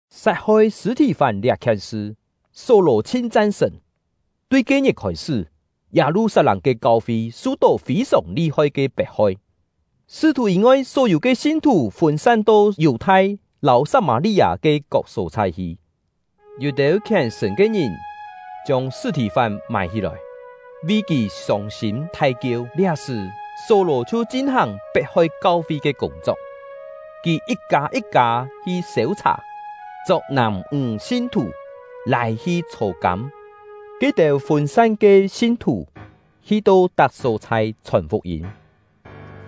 Sat-hoi Sṳ̂-thì-fán liá-khien sṳ, Só-lò chhin chan-sṳ̀n. Só-lò Pet-hoi Kau-fi Tui ke-ngit khôi-sṳ́, Yâ-lu-sat-lâng ke kau-fi su-tó fî-sòng li-hoi ke pet-hoi. Sṳ́-thù yî-ngoi, só-yû ke sin-thù fûn-san to Yù-thai lâu Sat-mâ-li-â ke kok só-chhai hi. Yû-têu khièn-sṳ̀n ke ngìn chiông Sṳ̂-thì-fán mài-hí-lòi, vi kì sông-sîm thai-kieu. Liá-sṳ̀, Só-lò chhiu chin-hàng pet-hoi kau-fi ke kûng-chok; kì yit-kâ yit-kâ hi sêu-chhà, chok nàm-ńg sin-thù, lâi-hi chhô-kâm. Ke-têu fûn-san ke sin-thù hi-to tak só-chhai chhòn fuk-yîm.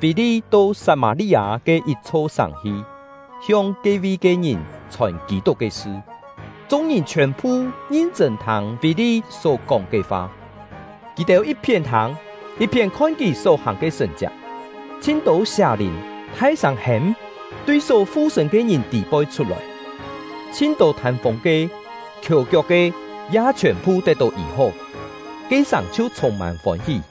Fî-li to Sat-mâ-li-â ke yit-chho sàng hi, hiong ke-vi ke ngìn chhòn Kî-tuk ke sṳ. Chung-ngìn chhiòn-phu ngin-chṳ̂n thâng Fî-li só-kóng ke fa. Kì-têu yit-phién thâng, yit-phién khon kì só-hàng ke sṳ̀n-chiak. Chhin-tô sià-lìn thai-sâng hêm, tui só fu-sṳ̂n ke ngìn tî-poi chhut-lòi; chhin-tô thân-fûng ke, khiò-kiok ke, ya chhiòn-phu tet-tó yî-hó. Ke-sàng chhiu chhûng-mân fôn-hí.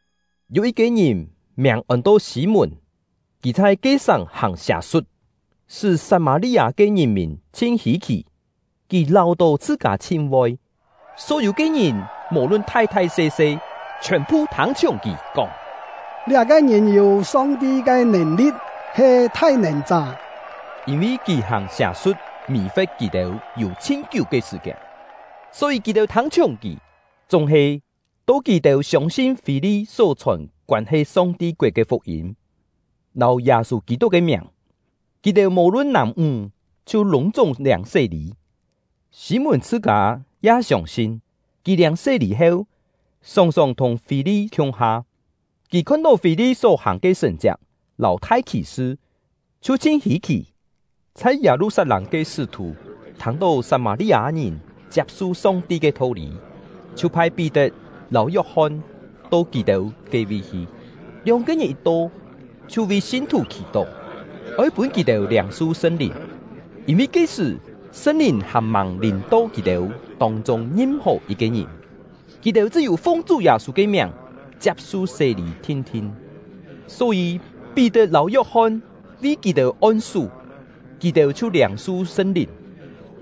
Yû yit-ke ngìn, miàng ôn-to Sî-mùn, kì chhai ke-sàng hàng sià-su̍t, sṳ́ Sat-mâ-li-â ke ngìn-mìn chhin hî-khì. Kì láu-tó chhṳ-kâ chhin voi; só-yû ke ngìn, mò-lun thai-thai se-se, chhiòn-phu thâng-chhiùng kì, kóng: “Liá-ke ngìn yû Song-ti ke nèn-li̍t, he ‘Thai-nèn-chá’.” Yîn-vi kì hàng sià-su̍t mì-fe̍t kì-têu yû chhin-kiú ke sṳ̀-kiên, só-yî kì-têu thâng-chhiùng kì. Chúng-he, to kì-têu siông-sin Fî-li só chhòn koân-he Song-ti koet ke fuk-yîm lâu Yâ-sû Kî-tuk ke miàng, kì-têu mò-lun nàm-ńg chhiu lûng-chúng liâng sé-lî. Sî-mùn chhṳ-kâ ya siông-sin; kì liâng sé-lî heu, sòng-sòng thùng Fî-li khiung-ha. Kì khon-tó Fî-li só-hàng ke sṳ̀n-chiak lâu thai khì-sṳ, chhiu chhin hî-khì. Chhai Yâ-lu-sat-lâng ke sṳ́-thù thâng-tó Sat-mâ-li-â-ngìn chiap-su Song-ti ke tho-lî, chhiu phai Pí-tet lâu Yok-hon to kì-têu ke-vi hi. Lióng-ke ngìn yit to, chhiu vi sin-thù khì-tó, oi pûn kì-têu liâng-su Sṳn-Lìn, yîn-vi ke-sṳ̀ Sṳn-Lìn hàn-màng lìm-to kì-têu tông-chûng ngim-hò yit-ke ngìn; kì-têu chṳ́-yû fung Chú Yâ-sû ke miàng chiap-su sé-lî thin-thin. Só-yî Pí-tet lâu Yok-hon vi kì-têu on-sú, kì-têu chhiu liâng-su Sṳn-Lìn.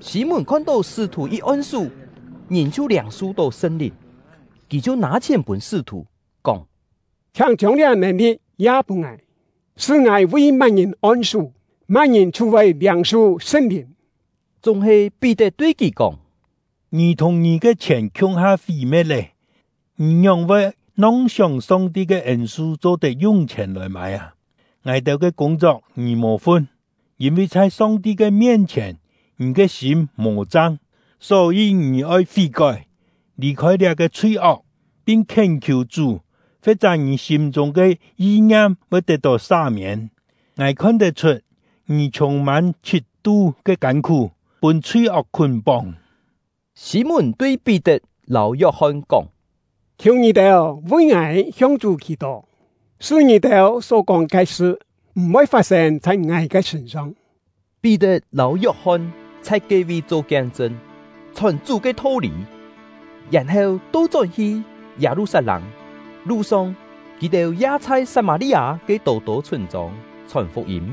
Sî-mùn khon-tó sṳ́-thù yit on-sú, ngìn chhiu liâng-su-tó Sṳn-Lìn, kì chhiu nâ-chhièn pûn sṳ́-thù, kóng: “Chhiáng chiông liá nèn-li̍t ya pûn ngài, sṳ́ ngài vi má-ngìn on-sú, má-ngìn chhiu voi liâng-su Sṳn-Lìn.” Chúng-he Pí-tet tui kì kóng: “Ngì thùng ngì ke chhièn khiung-ha fí-me̍t lê! Ngì ngióng-voi nong-sióng Song-ti ke ên-su cho-tet yung chhièn lòi mâi â! Ngài-têu ke kûng-chok ngì mò fun; yîn-vi chhai Song-ti ke mien-chhièn, ngì ke sîm mò chang. Só-yî ngì oi fí-kói, lì-khôi liá-ke chhui-ok, pin khién-khiù Chú; fe̍t-chá ngì sîm-chûng ke yi-ngiam voi tet-tó sa-miên. Ngài khon tet-chhut, ngì chhûng-mân chhit-tu ke kân-khú, pûn chhui-ok khún-póng.” Sî-mùn tui Pí-tet lâu Yok-hon kóng: “Khiù ngì-têu vi ngài hiong Chú khì-tó, sṳ́ ngì-têu só-kóng ke sṳ, m̀-voi fat-sên chhai ngài ke sṳ̂n-song.” Pí-tet lâu Yok-hon chhai ke-vi cho kien-chṳn, chhòn Chú ke tho-lî, yèn-heu to-chón hi Yâ-lu-sat-lâng. Lu-song, kì-têu ya chhai Sat-mâ-li-â ke tô-tô chhûn-chông chhòn fuk-yîm.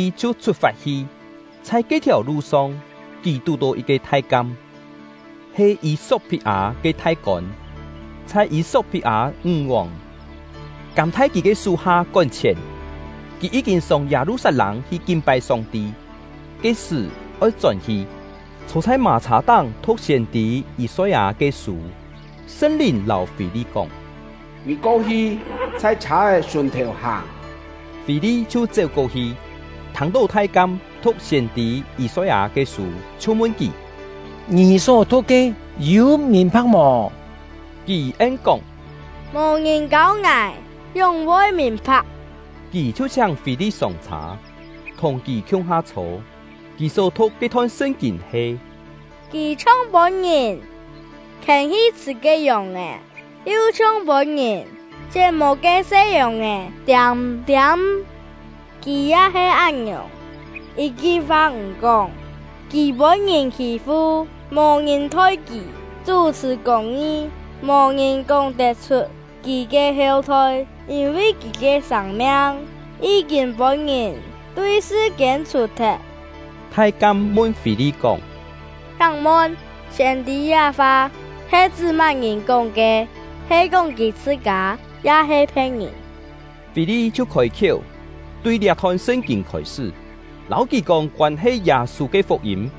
Fî-li chhiu chhut-fat hi. Chhai ke-thiàu lu-song, kì tù-tó yit-ke thai-kam, he Yî-sok-phit-â ke thai-kôn, chhai Yî-sok-phit-â ńg-vòng Kâm-thai-kî ke sú-ha kón-chhièn; kì yí-kîn sông Yâ-lu-sat-lâng hi kin-pai Song-ti, ke-sṳ̀ oi chón-hi, chhô chhai mâ-chhâ-táng thu̍k siên-tî Yî-soi-â ke sû. Sṳn-Lìn lâu Fî-li kóng: “Ngì ko-hi, chhai chhâ-é sùn-thèu hàng.” Fî-li chhiu chéu-ko-hi, thâng-tó thai-kam thu̍k siên-tî Yî-soi-â ke sû, chhiu mun kì: “Ngì só thu̍k ke, yû mìn-pha̍k mò?” Kì en-kóng: “Mò ngìn kâu ngài, ngióng-voi mìn-pha̍k?” Kì chhiu chhiáng Fî-li sông-chhâ, thùng kì khiung-ha chhô. Kì só thu̍k ke-thon Sṳn-kîn he: Kì chhiong pûn-ngìn khiên-hi chhṳ̀ ke yòng-è, yu chhiong pûn-ngìn chién-mô ke se yòng-è tiâm-tiâm; kì ya he án-ngiòng, yit-ki fa m̀ kóng. Kì pûn-ngìn khî-fu; mò ngìn thoi kì chú-chhṳ̀ kûng-ngi. Mò ngìn kóng-tet-chhut kì ke heu-thoi, yîn-vi kì ke sâng-miang yí-kîn pûn-ngìn tui sṳ-kiên chhù-thet. Thai-kam mun Fî-li kóng: “Chhiáng mun, siên-tî liá-fa he chṳ́ má-ngìn kóng ke? He kóng kì chhṳ-kâ, ya-he phe̍t-ngìn?” Fî-li chhiu khôi-khiéu, tui liá-thon Sṳn-kîn khôi-sṳ́, lâu kì kóng koân-he Yâ-sû ke fuk-yîm.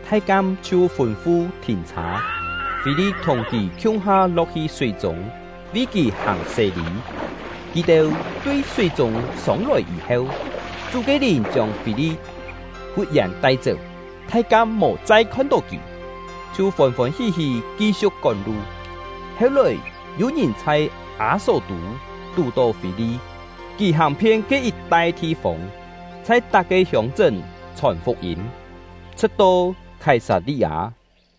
Thai-kam chhiu fûn-fu thìn-chhâ; Fî-li thùng kì khiung-ha lo̍k-hi súi-chûng, vi kì hàng sé-lî. Kì-têu tui súi-chûng sông-lòi yî-heu, Chú ke Lìn chiông Fî-li fut-yèn tai-chéu; thai-kam mò chai khon-tó kì, chhiu fôn-fôn hí-hí ki-siu̍k kón-lu. Heu-lòi, yû-ngìn chhai Â-só-tû tù-tó Fî-li; kì hàng-phien ke yit-tai thi-fông, chhai tak-ke hiông-chṳ́n chhòn fuk-yîm, chhṳ̍t-to Khái-sat-li-â.